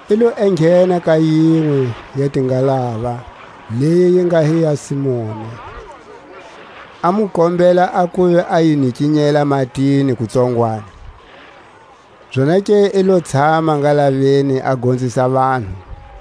I lo enghena ka yinwe ya tingalava, leyi yi nga hi ya Simoni, a mu kombela a kuva a yi nikinyela matini kutsongwani; zonake i lo tshama ngalaveni a gonzisa vanhu.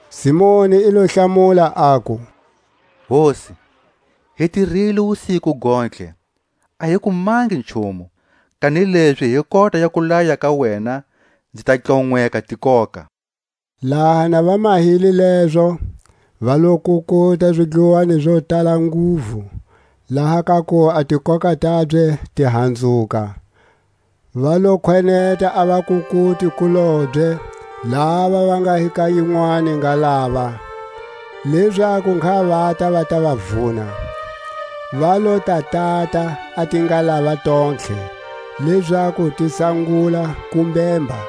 Simoni i lo hlamula, aku: Hosi, hi tirile wusiku gontlhe, a hi kumangi nchumu; kanilezi hi kota ya kulaya ka wena nzi ta tlonweka tikoka. Laha na va mahile lezo, va lo kukuta zidluwani zo tala nguvu, laha ka kuva a tikoka tabye ti hanzuka. Va lo khweneta a vakukuti-kulobye lava va nga hi ka yinwani ngalava, lezaku ngha vata va ta va vuna. Va lo ta tata a tingalava tontlhe, lezaku ti sangula ku mhemba.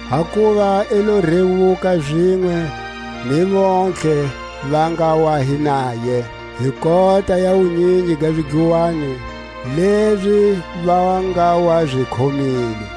Hakuva i lo rewuka, zinwe ni vontlhe va nga wa hi naye, hi kota ya wunyingi ga zidluwani lezi va nga wa zi khomile.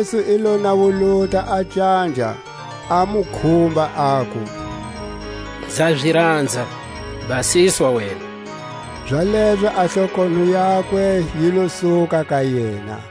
Jesu i lo nawuluta a canja, a mu khumba, aku: Nza zi ranza, basiswa wena. Zalezo a hlokonho yakwe yi lo suka ka yena.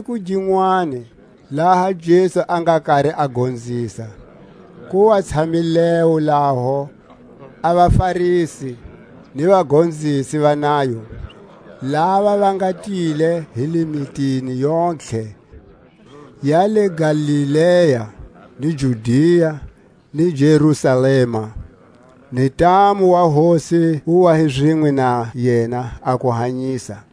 A siku ginwani laha Jesu a nga kari a gonzisa, ku wa tshamilewo laho a vaFarisi ni vagonzisi va nayo, lava va nga tile hi le mitini yontlhe ya le Galilea ni Judia ni Jerusalema; ni ntamu wa Hosi wu wa hi zinwe na yena a ku hanyisa.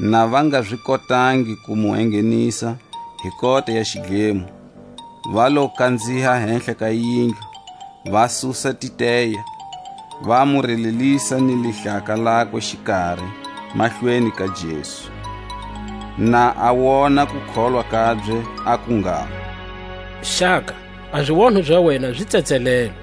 Na va nga zi kotangi ku mu enghenisa hi kota ya xidlemo, va lo kanziha hehla ka yindlu, va susa titeya, va mu relelisa ni lihlaka lakwe xikari mahlweni ka Jesu. Na a wona kukholwa kabye, aku ngalo: Xaka, a zionho za wena zi tsetselelwe.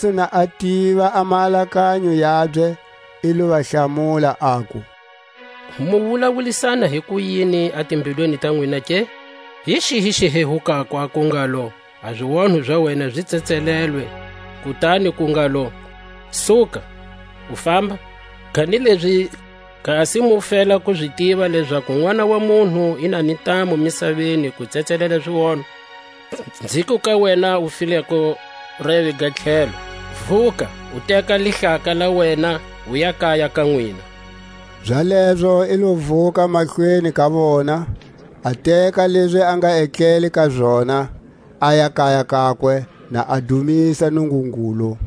Jesu na a tiva a maalakanyo yabye, i lo va hlamula, aku: Mu wulawulisana hikuyini a timbilwini ta nwina ke? Hi xihi xi hehukako, aku ngalo: A zionho za wena zi tsetselelwe, kutani ku ngalo: Suka, u famba? Kanilezi kasi mu fela ku zi tiva lezaku Nʼwana wa munhu i na ni ntamu misaveni ku tsetselela zionho, nziku ka wena u fileko reve ga tlhelo: Vuka, u teka lihlaka la wena, uya kaya ka nwina. Zalezo i lo vuka mahlweni ka vona, a teka lezi a nga etlele ka zona, aya kaya kakwe, na a dumisa Nungungulu.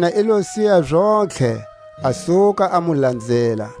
Yena i lo siya zontlhe, a suka a mu lanzela.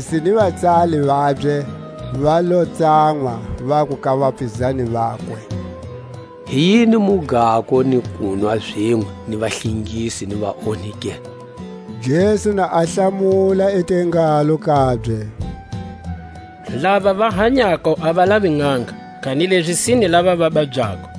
A vaFarisi ni vatsali vabye va lo tsanwa, vaku ka vapizani vakwe: Hi yini mu gako ni kunwa zinwe ni vahlengisi ni vaonhi ke? Jesu na a hlamula i te ngalo kabye: Lava va hanyako a va lavi nʼanga, kanilezi sine lava va babyako.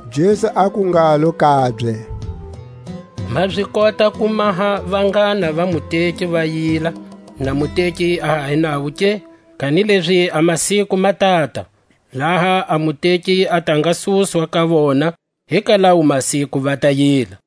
Jesu aku ngalo kabye: Ma zi kota ku maha vanghana va muteki va yila, na muteki a ha hi navo ke? Kanilezi a masiku ma tata, laha a muteki a ta nga suswa ka vona, hi ka lawo masiku va ta yila.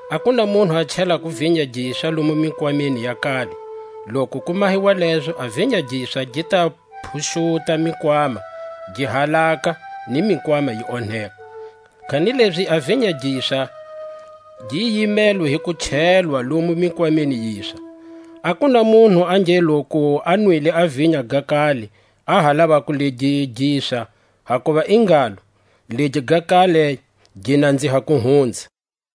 A ku na munhu a chelako vinya giswa lomu mikwameni ya kale; loku ku mahiwa lezo a vinya giswa gi ta phuxuta mikwama, gi halaka, ni mikwama yi onheka. Kanilezi a vinya giswa gi yimelwe hi ku chelwa lomu mikwameni yiswa. A ku na munhu a nge loku a nwile a vinya ga kale, a ha lavako legi giswa; hakuva i ngalo; Legi ga kale gi nanziha ku hunza.